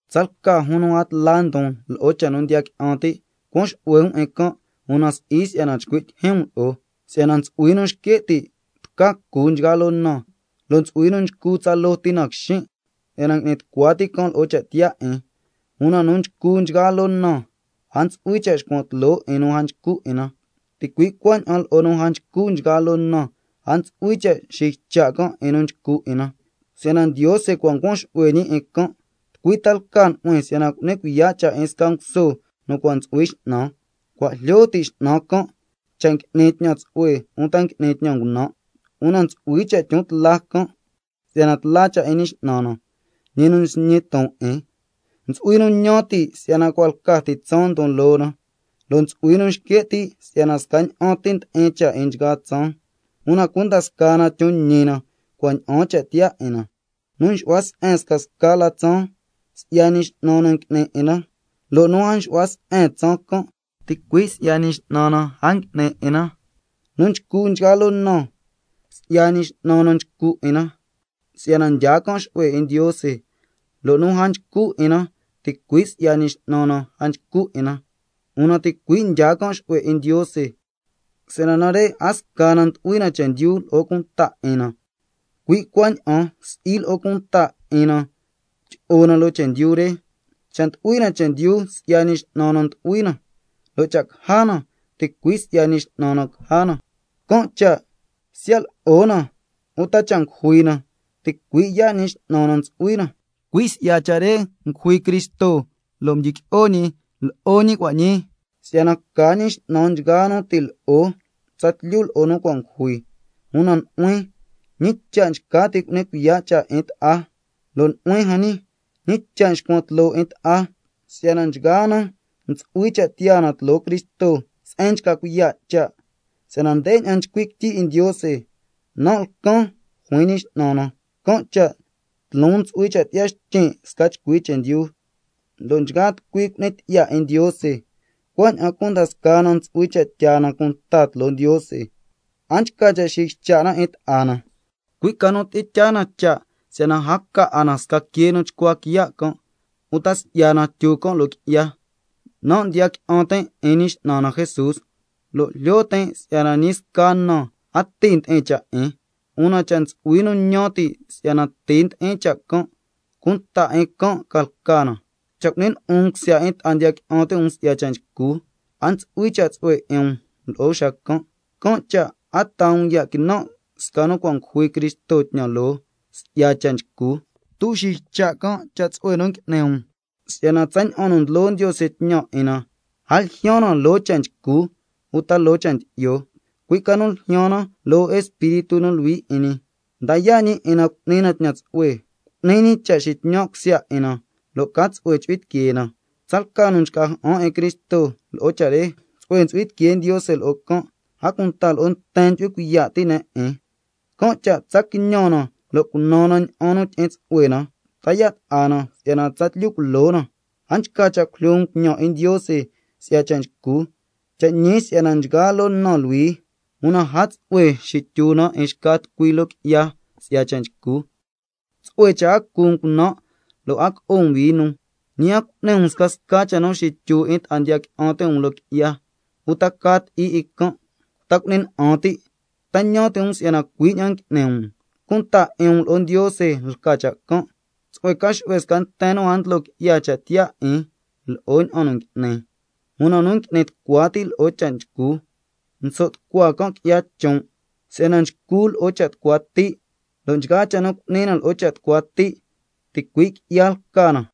Tsalca jun nu a tla ndon lo'o cha' nu ndiya qui'an ti', cuan xu'hue um 'in can', una si'i si'yana chcui' tyijyin um lo'o. Si'yana ntsu'hui nu nxque' ti' tca cu nchgaa loo na, lo' ntsu'hui nu nchcu tsaloo ti na quixin', si'yana ngui'ni tucua ti' can' lo'o cha' tiyaa 'in. Una nu nchcu nchgaa loo na, a ntsu'hui cha' xcuan tloo 'in nu a nchcu 'in na, ticui' cuaña'an nu a nchcu nchgaa loo na, a ntsu'hui cha' xiycha' can' 'in nu nchcu 'in na, si'yana Ndiose cua' ncuan xu'hue ñi 'in can'. ¿Tucui ta lca nu'huin si'yana cu'ni cuiya' cha' 'in sca nguso nu cua' ntsu'hui x'nan? Cua' jlyo ti' x'nan can', cha' ngui'ni tñan tsu'hue uta ngui'ni tñan ngunan', una ntsu'hui cha' tyon tla can' si'yana tla cha' 'in Ñi X'nan na, ñi nu nsñi ton 'in. Ntsu'hui nu ñan ti' si'yana cua' lca ti tsaan ndon loo na, lo' ntsu'hui nu nxque' ti' si'yana scaña'an ti ndi'in cha' 'in nchgaa tsaan, una cunda scaa na tyon ñi na cua' ña'aan cha' tiyaa 'in na. Nu nxu'hua se'en scasca la tsaan, si'ya Ñi X'nan na ngui'ni 'in na, lo' nu a nxu'hua se'en tsaan can', ticui' si'ya Ñi X'nan na a ngui'ni 'in na. Nu nchcu nchgaa loo na, si'ya Ñi X'nan na nchcu 'in na si'yana ndyaa can' xu'hue 'in Ndiose, lo' nu a nchcu 'in na ticui' si'ya Ñi X'nan na a nchcu 'in na, una ticui' ndyaa can' xu'hue 'in Ndiose. Si'yana nare' a sca na ndu'hui na chendyu lo'o cunta 'in na, cui' cuaña'an si'i lo'o cunta 'in na tyi'o na loo chendyu re. Cha' ndu'hui na chendyu, si'ya Ñi X'nan na ndu'hui na, lo' cha' caja na, ticui' si'ya Ñi X'nan na caja na. Can' cha' siya' lo'o na uta cha' ngujui na, ticui' yaa' Ñi X'nan na ntsu'hui na. Cui' si'ya cha' re ngujui Cristo lo' mdyiqui'o ñi, lo'o ñi cua' ñii si'yana ca ñi X'nan nchgaa nu ti' lo'o tsatlyu lo'o nu cua' ngujui. Una nu'huin, ¿ñi cha' nchca ti' cu'ni cuiya' cha' 'in ta'a? Lo' nu'huin jan ñi, ¿ñi cha' nxcuan tloo 'in ta'a? Si'yana nchgaa na ntsu'hui cha' tiyaa na tloo Cristo se'en nchca cuiya' cha'. Si'yana ndeña'an nchcui' quityi 'in Ndiose: —Nan' lcan, juin Ñi X'nan na, can' cha' tloon ntsu'hui cha' tyi'ya xtyin' sca chcui chendyu, lo' nchgaa tucui cu'ni tyi'ya 'in Ndiose—. Cuaña'an cunda scaa na ntsu'hui cha' tyaa na cunta tloo Ndiose. A nchca cha' xiycha' na 'in ta'a na, cui' ca nu tyi'in tyaa na cha' si'yana a ca 'a na sca quee nu chcua quiya' can', lo' tsato'o tyu loo qui'ya. Nan' ndiya qui'an tin' 'in Ñi X'nan na Jesús, lo' jlyo tin' si'yana ñi sca na a ti ndi'in cha' 'in, una cha' ntsu'hui nu ñan ti' si'yana ti ndi'in cha' can', cunta 'in can' ca lca na. Cha' cu'ni lyi'un um cusya 'in ta'a ndiya qui'an ti' um si'ya cha' nchcu, a ntsu'hui cha' tsu'hue 'in um lo'o xacan'. Can' cha' a taa um ya' quinan' sca nu cua' ngujui Cristo tñan loo si'ya cha' nchcu. A tsato'o xiycha' can' cha' tsu'hue nu ngui'ni um, si'yana tsaña'an nu ndlo Ndiose tñan 'in na, a ljyaan na loo cha' nchcu uta loo cha' ndyi'yo, cui' ca nu ljyaan na loo Espíritu nu Luhui 'in ñi, ndaa yaa' ñi 'in na cu'ni na tñan tsu'hue, cu'ni ñi cha' tyi'in tsu'hue na lo' ca tsu'hue chu'hui tiquee na. Tsalca nu nchca ja'an 'in Cristo lo'o cha' re, tsu'hue ntsu'hui tiquee Ndiose lo'o can', a cunta lo'o nten ndyu'hui cuiya' ti' ne' 'in. Can' cha' tsa quiñan na lo' cunan na ña'an nu tyi'in tsu'hue na, ta yaa' ta'a na si'yana tsatlyu culo na. A nchca cha' cujlyo um tñan 'in Ndiose si'ya cha' nchcu. Cha' ñi si'yana nchgaa loo na luhui, una a tsu'hue xityu na 'in xca tucui loo qui'ya si'ya cha' nchcu. Una tsu'hue cha' a cu um cunan' lo' a co'o um vino, ñi a cu'ni um scasca cha' nu xityu 'in ta'a ndiya qui'an ti' um loo qui'ya, uta ca ti'i 'in can', ta cu'ni na'an ti'. ¿Ta ñan ti' um si'yana cui' ña'an ngui'ni um? Una cunta 'in um lo'o Ndiose lca cha' can'. Una tsu'hue ca xu'hue sca nten nu a ndlo qui'ya cha' tiyaa 'in lo'o ña'an nu ngui'ni. Nu ngui'ni tucua ti' lo'o cha' nchcu, nso' tucua can' qui'ya chon', si'yana nchcu can' lo'o cha' tucua ti', lo' nchgaa cha' nu cu'ni na lo'o cha' tucua ti', ticui' qui'ya lca na.